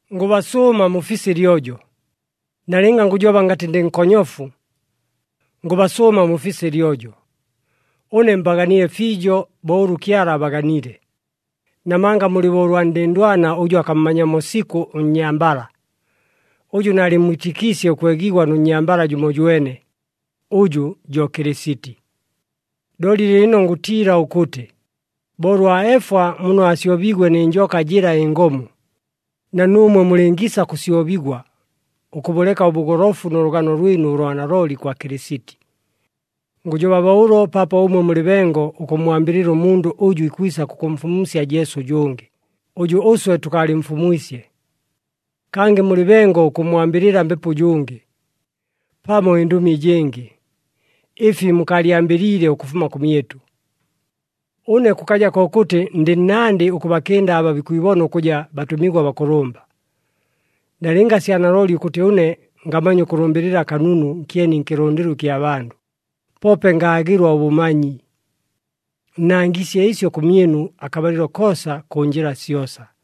Ngʉbasʉʉma mufise ɨlyojo, nalɨnga ngʉjoba ngatɨ ndɨ nkonyofu. Ngʉbasʉʉma mufise ɨlyojo! Ʉne mbaganile fiijo, bo ʉlʉ Kyala abaganile, namanga mulɨ bo ʉlwa ndɨndwana ʉjʉ akammanyamo sikʉ ʉnnyambala, ʉjʉ naalɨmmwitɨkiisye ʉkwegigwa nʉ nnyambala jʉmojwene, ʉjʉ jo Kɨlɨsiti. Looli lɨɨlɨno ngʉtiila ʉkʉtɨ, bo ʉlwa Efwa muno aasyobiigwe nɨ njoka jɨla ɨngomu, na nuumwe mulɨngiisa kʉsyobigwa, ʉkʉbʉleka ʉbʉgolofu nʉ lʉgano lwɨnu ʉlwa nalooli kwa Kɨlɨsiti. Ngʉjoba bo ʉlo paapo ʉmwe mulɨ bengo ʉkʉmmwambɨlɨla ʉmundʉ ʉjʉ ikwisa kʉkʉmfumusya Jesu ʉjʉngɨ, ʉjʉ ʉswe tʉkaalɨmfumwisye. Kangɨ mulɨ bengo ʉkʉmmwambɨlɨla mbepo ʉjʉngɨ, pamo ɨndʉmi ɨjɨngɨ, ɨfi mukaalyambɨliile ʉkʉfuma kʉmyɨtʉ. Ʉne kʉkaja kokʉtɨ ndɨ nnandɨ ʉkʉbakɨnda aba bikwibona ʉkʉja, “Batʉmigwa bakʉlʉmba.” Nalɨnga sya nalooli ʉkʉtɨ ʉne ngamanya ʉkʉlʉmbɨlɨla kanunu nkyeni nkɨlʉndɨlo ɨkya bandʉ, poope ngaagɨlwa ʉbʉmanyi. Nnangiisye ɨsyo kʉmyɨnu akabalɨlo koosa kʉ njɨla syosa.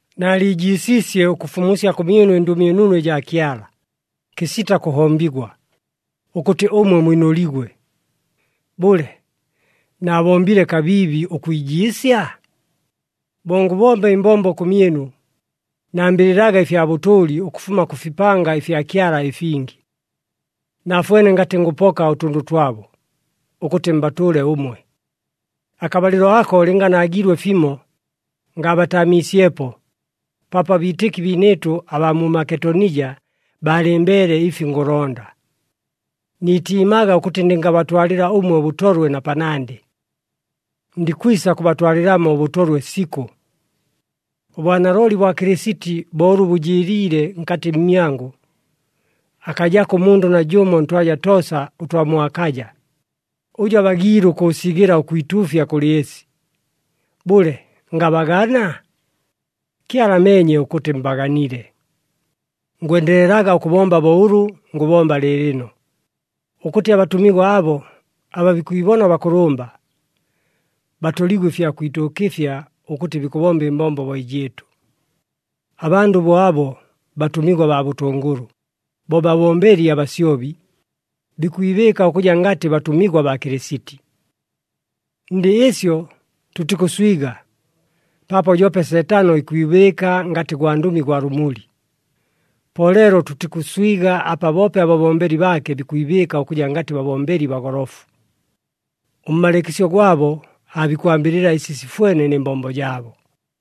Naaliijiisiisye ʉkʉfumusya kʉmyɨnu ɨNdʉmi ɨNunu ɨjaa Kyala, kɨsita kʉhombigwa, ʉkʉtɨ ʉmwe mwinʉligwe. Bʉle, naabombile kabiibi ʉkwijiisya? Bo ngʉbomba ɨmbombo kʉmyɨnu, nambɨlɨlaga ɨfya bʉtʉʉli ʉkʉfuma kʉ fipanga ɨfya Kyala ɨfingi. Naafwene ngatɨ ngʉpoka ʉtʉndʉ twabo, ʉkʉtɨ mbatʉʉle ʉmwe. Akabalɨlo ako lɨnga naagiilwe fimo, ngaabataamiisyepo, paapo abiitɨki biinɨɨtʉ abaa mu Maketonija baalɨmbeele ɨfi ngʉlonda. Niitiimaga ʉkʉtɨ ndɨngabatwalɨla ʉmwe ʉbʉtolwe na panandɨ. Ndikwisa kʉbatwalɨlamo ʉbʉtolwe sikʉ! Ʉbwanalooli bwa Kɨlɨsiti bo ʉlʉ bʉjɨɨliile nkatɨ mmyangʉ, akajako ʉmundʉ najʉmo ntwaja toosa ʉtwa mu Akaja, ʉjʉ abagiile ʉkʉʉsigɨla ʉkwituufya kʉlɨ ɨsi. Bʉle, ngabagana? Kyala ameenye ʉkʉtɨ mbaganile. Ngwendelelaga ʉkʉbomba bo ʉlʉ ngʉbomba lɨɨlɨno, ʉkʉtɨ abatʉmigwa abo aba bikwibona bakʉlʉmba, batoligwe ɨfya kwituukɨfya ʉkʉtɨ bikʉbomba ɨmbombo bo ɨjɨɨtʉ. Abandʉ bo abo, batʉmigwa baa bʉtʉngʉlʉ, bo babombeli abasyobi, bikwibɨɨka ʉkʉja ngatɨ batʉmigwa baa Kɨlɨsiti. Ndɨ ɨsyo tʉtikʉswiga, paapo joope Seetano ikwibɨɨka ngatɨ gwandʉmi gwa lʉmuli. Po leelo tʉtikʉswiga apa boope ababombeli baake bikwibɨɨka ʉkʉja ngatɨ babombeli bagolofu. Ʉmmalɨɨkɨsyo gwabo aabikwambɨlɨla ɨsi sifwene nɨ mbombo jaabo.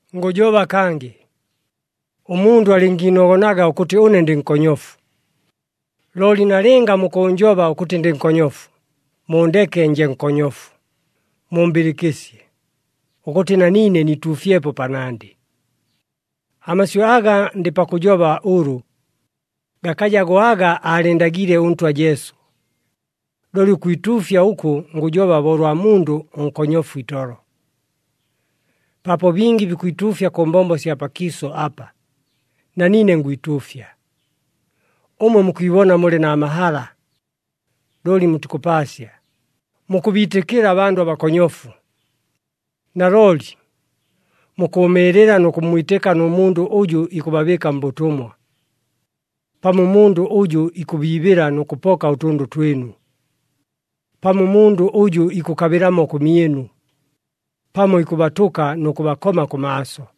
Ngʉjoba kangɨ, ʉmundʉ alɨngiinogonaga ʉkʉtɨ ʉne ndɨ nkonyofu! Looli nalɨnga mukʉʉnjoba ʉkʉtɨ ndɨ nkonyofu, muundeke nje nkonyofu, mumbɨlɨkɨsye, ʉkʉtɨ na niine niituufyepo panandɨ. Amasyʉ aga ndɨ pakʉjoba ʉlʉ, gakaja go aga aalɨɨndagiile ʉNtwa Jesu, looli ʉkwituufya ʉkʉ ngʉjoba bo ʉlwa mundʉ ʉnkonyofu itolo. Paapo bingi bikwituufya kʉ mbombo sya pakiisʉ apa, na niine ngwituufya. Ʉmwe mukwibona mulɨ na mahala! Looli mutikʉpaasya, mukʉbiitɨkɨla abandʉ abakonyofu! Nalooli, mukʉʉmɨɨlɨla nʉ kʉmmwitɨka nʉ mundʉ ʉjʉ ikʉbabɨɨka mbʉtʉmwa! Pamo ʉmundʉ ʉjʉ ikʉbiibɨla nʉ kʉpoka ʉtʉndʉ twɨnu! Pamo ʉmundʉ ʉjʉ ikʉkabɨlamo kʉmyɨnu, pamo ikʉbatʉka nʉ kʉbakoma kʉmaaso!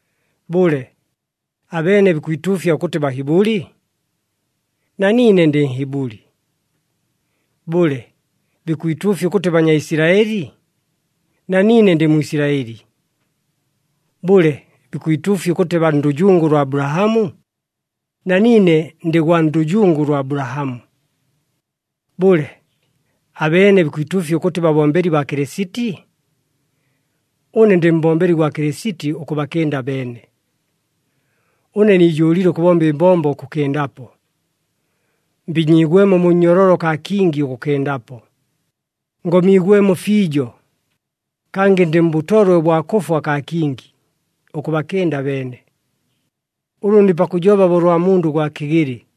Bʉle, abeene bikwituufya ʉkʉtɨ Bahibʉli? Na niine ndɨ Nhibʉli. Bʉle, bikwituufya ʉkʉtɨ Banyaisilaɨli? Na niine ndɨ Mwisilaɨli. Bʉle, bikwituufya ʉkʉtɨ baa ndʉjungu lwa Abulahamu? Na niine ndɨ gwa ndʉjungu lwa Abulahamu. Bʉle, abeene bikwituufya ʉkʉtɨ babombeli baa Kɨlɨsiti? Ʉne ndɨ mbombeli gwa Kɨlɨsiti ʉkʉbakɨnda abeene! Ʉne niijʉʉlile ʉkʉbomba ɨmbombo ʉkʉkɨndapo. Mbinyiigwemo mu nnyololo kaa kingi ʉkʉkɨndapo. Ngomiigwemo fiijo, kangɨ ndɨ mbʉtolwe ʉbwa kʉfwa kaa kingi, ʉkʉbakɨnda abeene. Ʉlʉ ndɨ pakʉjoba bo ʉlwa mundʉ ʉgwa kɨgɨlɨ.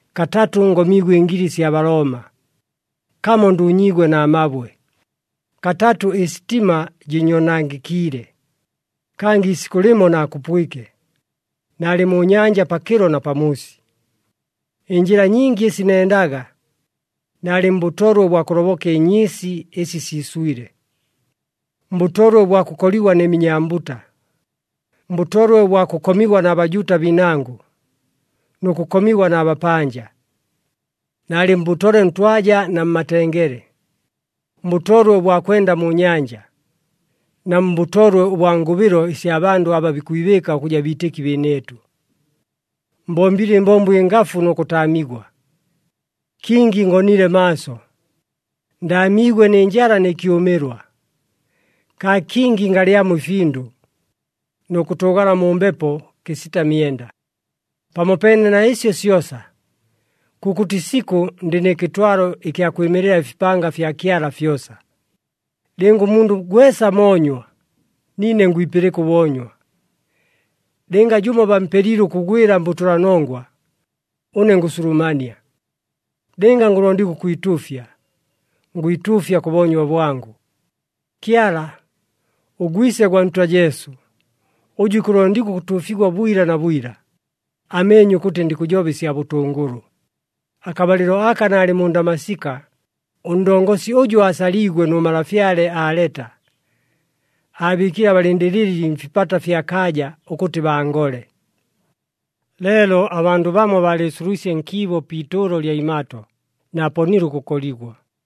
Katatʉ ngomiigwe ɨngili sya Balooma, kamo nduunyiigwe na mabwe, katatʉ ɨsitima jɨɨnyoonangɨkiile, kangɨ iisikʉ lɨmo naakupwike, naalɨ mu nyanja pakɨlo na pamuusi. Ɨnjɨla nyingi ɨsi nendaga, naalɨ mbʉtolwe ʉbwa kʉloboka ɨnyɨɨsi ɨsi siiswile, mbʉtolwe ʉbwa kʉkoligwa nɨ minyambuta, mbʉtolwe ʉbwa kʉkomigwa na Bajuuta biinangʉ, nʉ kʉkomigwa na bapanja. Naalɨ mbʉtolwe ntwaja na mmatengele, mbʉtolwe ʉbwa kwenda mu nyanja, na mbʉtolwe ʉbwa ngʉbɨlo ɨsya bandʉ aba bikwibɨɨka ʉkʉja biitɨki biinɨɨtʉ. Mbombile ɨmbombo ɨngafu nʉ kʉtaamigwa, kingi ngonile maaso, ndaamiigwe nɨ njala nɨ kyʉmɨlwa, kaa kingi ngalyamo ɨfindʉ, nʉ kʉtʉʉgala mu mbepo kɨsita myenda. Pamopeene na ɨsyo syosa, kʉkʉtɨ isikʉ ndɨ nɨ kɨtwalo ɨkya kwɨmɨlɨla ɨfipanga fya Kyala fyosa. Lɨnga ʉmundʉ gwesa moonywa, niine ngwipɨlɨka ʉboonywa. Lɨnga jʉmo bampelile ʉkʉgwɨla mbʉtʉlanongwa, ʉne ngʉsulumania. Lɨnga ngʉlondigwa ʉkwituufya, ngwituufya kʉ boonywa bwangʉ. Kyala, ʉGwise gwa Ntwa Jesu, ʉjʉ ikʉlondigwa ʉkʉtuufigwa bwila na bwila, ameenye ʉkʉtɨ ndikʉjoba ɨsya bʉtʉngʉlʉ. Akabalɨlo aka naalɨ mu Ndamasika, ʉndongosi ʉjʉ aasaliigwe nʉ malafyale Aleta, aabɨɨkile abalɨndɨlɨli mfipata fya kaaja, ʉkʉtɨ bangole. Leelo abandʉ bamo baalɨɨsulwisye nkiibo pi itʉʉlo lya imato, naaponile ʉkʉkoligwa.